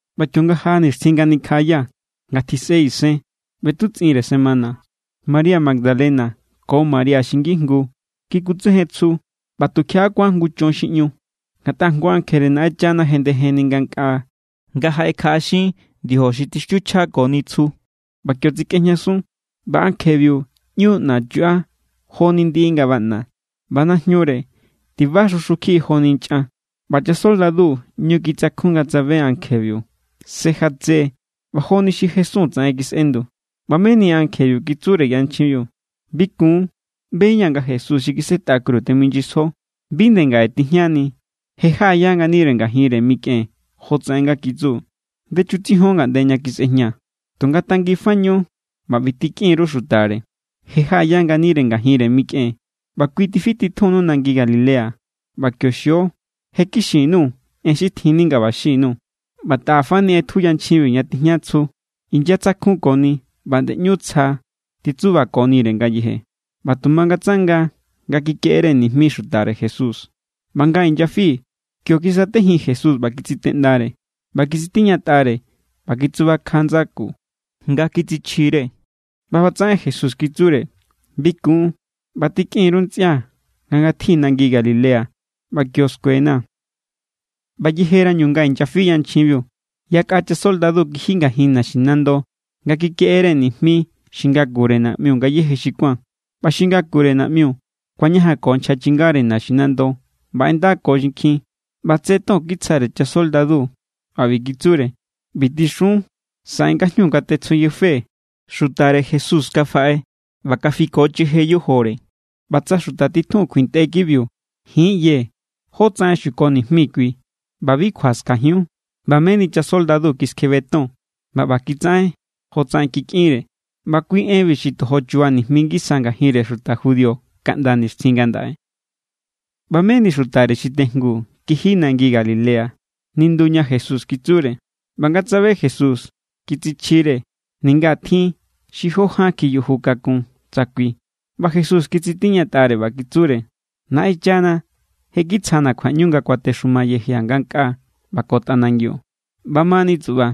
ꞌBa kionga jaꞌa nixtjin nga nikjaꞌaya, nga tjisꞌe isen ꞌbetutsꞌinre semana, María Magdalena ko María xi ngijngu kikutsejen tsju. ꞌBa tukjiaꞌa kuán jngu chon xi ꞌñu, ngatꞌa jngu ankjere Naꞌenchana jendejenni ngankꞌaa nga jaꞌekjaꞌaxin ndiojo xi tixtiuchjákoni tsju ꞌba kio tsikꞌejñasun. ꞌBa ankjebiu ꞌñu ꞌna chuꞌa joni ndiꞌi nga baꞌna, ꞌba najñure tiba xu xu kjiꞌi joni nchꞌan. ꞌBa chasoldadu ꞌñu kitsakjun nga tsabe ankjebiu. Se jatse= ꞌba joni xi jesun tsaꞌen kisꞌendu. ꞌBa meni ankjebiu kitsure yanchjinbiu: —Bi kun. ꞌBeña̱ nga Jesús xi kisetꞌa kru teminyisjo. Bi nde ngaꞌe tijñani, je jaꞌaya nganire ngajinre mikꞌen jotsaꞌen nga kitsu. Ndechutsijon ngaꞌnde ña kisꞌejña. Tunga tanginfañu ꞌba ꞌbi tikꞌin_ru xutare: “Je jaꞌaya nganire ngajinre mikꞌen, ꞌba kui tifititjunnu nangi Galilea. ꞌBa kio xio.” Je kixin_nuu̱ en xi tjinni nga ꞌba xin_nuu̱. ꞌBa taꞌafani ꞌetju yanchjinbiu ña tijña tsju, inyatsakjukoni ꞌba nde ꞌñu tsja titsubakonire ngayeje. ꞌBa tu mangatsanga nga kikeꞌere nijmi xutare Jesús. ꞌBa nga inyafi, kio kisatejin Jesús ꞌba kitsiteꞌndare. ꞌBa kitsitiñatꞌare ꞌba kitsubakja ndsaku nga kitsichjire. ꞌBa ꞌbatsaꞌen Jesús kitsure: —Bi kun, ꞌba tikꞌin_ru ntsꞌia nga ngatji nangi Galilea, ꞌba kio skuena̱. ꞌBa yejerañu nga inyafi yanchjinbiu, yakꞌa chasoldadu kiji ngajin naxinando nga kikeꞌere nijmi xi ngakure naꞌmiu ngayéje xi kuán. ꞌBa xi ngakure naꞌmiu kuañajanko nchja chingare naxinando ꞌba ꞌendako xinkjin. ꞌBa tse ton kitsjare chasoldadu ꞌba ꞌbi kitsure: —ꞌBi tixun: “Saꞌe ngajñu nga tetsjujñafee̱, xutare Jesús kafaꞌe ꞌba kafikocheje yojore.” ꞌBa tsa xuta titjun kjuintꞌe kibiu, ji̱n= ꞌyee̱ jotsaꞌen xuko nijmi kui. ꞌBa bi kjua skajiun. ꞌBa meni chasoldadu kiskjebe ton ꞌba ꞌba kitsaꞌen jotsaꞌen kikꞌinre. ꞌBa kui enbi xi tojo chuba nijmi ngisa ngajinre xuta judío kaꞌnda nixtjin ngandaꞌe. ꞌBa meni xutare xi tejngu kiji nangi Galilea, nindu ña Jesús kitsure. ꞌBa nga tsabe Jesús, kitsichjire, ninga tjin xi jó ján kjiyuju kakun tsa kui. ꞌBa Jesús kitsitiñatꞌare ꞌba kitsure: —Naꞌenchana je kitsjana̱ kjuaꞌñu nga kuatexuma yejia̱ ngankꞌaa ꞌba ko tꞌanangiu. ꞌBamani tsuꞌba,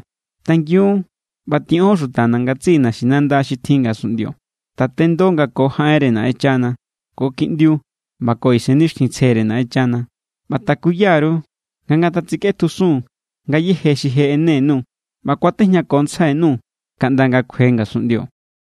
tangiun ꞌba tiꞌon xutana̱ ngatsiꞌi naxinanda xi tjin ngasunꞌndio. Tatendo nga ko jaꞌenre Naꞌenchana, ko Kiꞌndiu ꞌba ko Isennixtjintsjere Naꞌenchana. ꞌBa takuya_ru nga ngatatsikꞌetjusun ngayéje xi je ꞌene_nuu̱. ꞌBa kuatejñakontsjai_nuu̱ kaꞌnda nga kjue ngasunꞌndio.